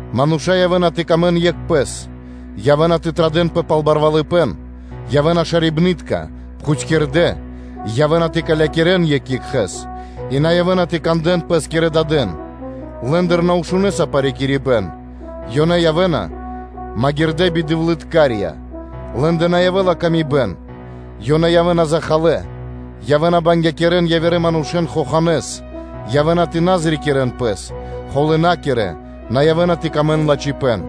Мануша́ на явэ́на тэ сыкавэ́н паты́в екх екхэ́скэ, явэ́на тэ традэнпэ пал барвалыпэ́н, явэ́на шарибнытка, пхутькирдэ́, явэ́на тэ калякирэн екх екхэ́с, и на явэ́на тэ кандэ́н пэ́скирэ кхангирья́кирэ пхурыдырэн, лэ́ндыр на шунэса парикирибэн, ёнэ явэ́на магирдэ́ бидэвлыткарья; лэ́ндэ на явэ́ла паты́в кэ яви́р мануша́, ёнэ явэ́на захалэ́, явэ́на тэ бангякирэн явирэ манушэ́н хоханэ́с, явэ́на тэ на зрикирэн пэс, холынакирэ, на явэ́ла пир ило́ лэ́нгэ лачхипэ́н;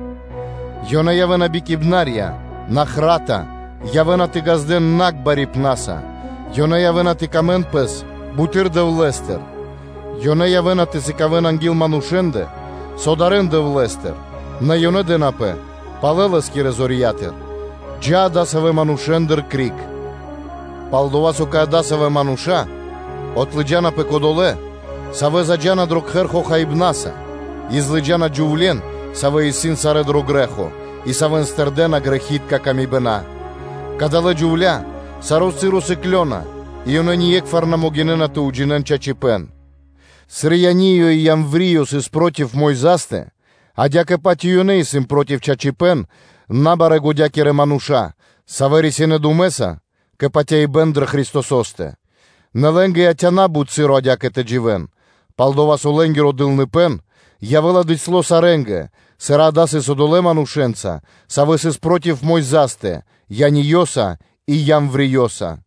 ёнэ явэ́на бикибнарья, нахрата, явэ́на тэ ґаздэ́н накх барипнаса, ёнэ явэ́на тэ ри́кирэн сыр дро́гима пэс буты́р Дэвлэ́стыр; ёнэ явэ́на тэ сыкавэ́н анги́л манушэ́ндэ, со дарэ́на Дэвлэ́стыр, нэ ёнэ дэнапэ палэ Лэ́скирэ зорья́тыр. Джа́ адасавэ́ манушэ́ндыр криг. Пал-дова́ со кэ адасавэ́ мануша́ отлыджанапэ кодолэ́, савэ́ заджа́на дро кхэр хохаибнаса и злыджана джувле́н, савэ́ исын сарэ́ дро грэ́хо, и савэ́н тырдэна грэхи́тка камибэна, Кадалэ́ джувля́ саро́ часо сыклёна и ёнэ ние́кхвар на могинэ́на тэ уджинэ́н чачипэ́н. Сыр Яниё (Ианниё) и Ямвриё (Иамвриё) сыс проти Мойзастэ, адя́кэ-паць и ёнэ исын проти чачипэ́н, набарэ́-годякирэ ёнэ исын мануша́, савэ́ рисинэ́ думэ́са пэ патяибэ́н дрэ Христосо́стэ. Нэ лэ́нгэ яця́пэ на́бут часо адя́кэ тэ дживэ́н, пал-дова́ со лэ́нгиро дылныпэ́н явэ́ла бицяло́ сарэ́нгэ, сыр дава́ сыс одолэ́ манушэ́нца, савэ́ сыс проти Мойзастэ: Яниёса и Ямвриёса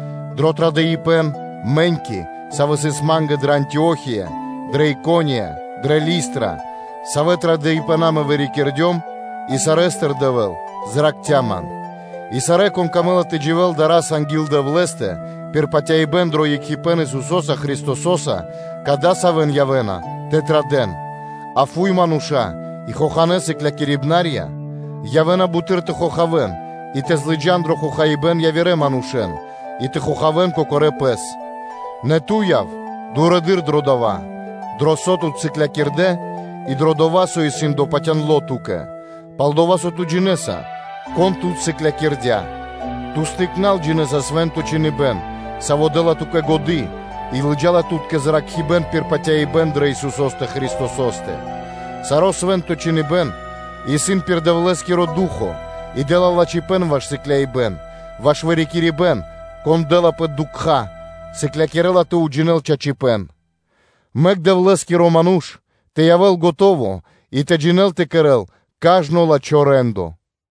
дро традыпэн, мэ́ньки, сыс савэ́ ма́нгэ дрэ Антио́хия, дрэ Икония, дрэ Листра, савэ́ традыпэна мэ вырикирдём, и сарэ́стыр Дэвэ́л зракхця́ ман. И сарэ́, кон камэ́ла тэ дживэ́л дара́са анги́л Дэвлэ́стэ пир патяибэ́н дро екхипэ́н Исусо́са Христосо́са, кадасавэн явэ́на тэ традэ́н. А фуй мануша́ и хоханэ́ сыклякирибнарья явэ́на буты́р тэ хохавэн и тэ залыджан дро хохаибэ́н явирэ манушэ́н и тэ хохавэн кокорэ́ пэс. Нэ ту яв дурэды́р дро дова́, дро со тут сыклякирдэ́ и дро дова́, со исын допатяндло ту́кэ, пал-дова́ со ту джинэ́са, кон тут сыклякирдя́. Ту тыкнорал (детствостыр) джинэ́са Свэ́нто Чхиныбэ́н, саво́ дэ́ла ту́кэ годы́ и лыджа́ла тут кэ зракхибэ́н пир патяибэ́н дрэ Исусо́стэ Христосо́стэ. Саро́ Свэ́нто Чхиныбэ́н исын пир Дэвлэ́скиро Ду́хо (Фа́но) и дэ́ла лачхипэ́н ваш сыкляибэн, ваш вырикирибэн – кон дэ́лапэ дукха́, сыклякирэ́ла тэ уджинэл чачипэ́н. Мэк Дэвлэ́скиро ману́ш тэ явэ́л скэдыно́, и тэ джинэ́л кэ кэрэ́л кажно лачхо́ рэ́ндо.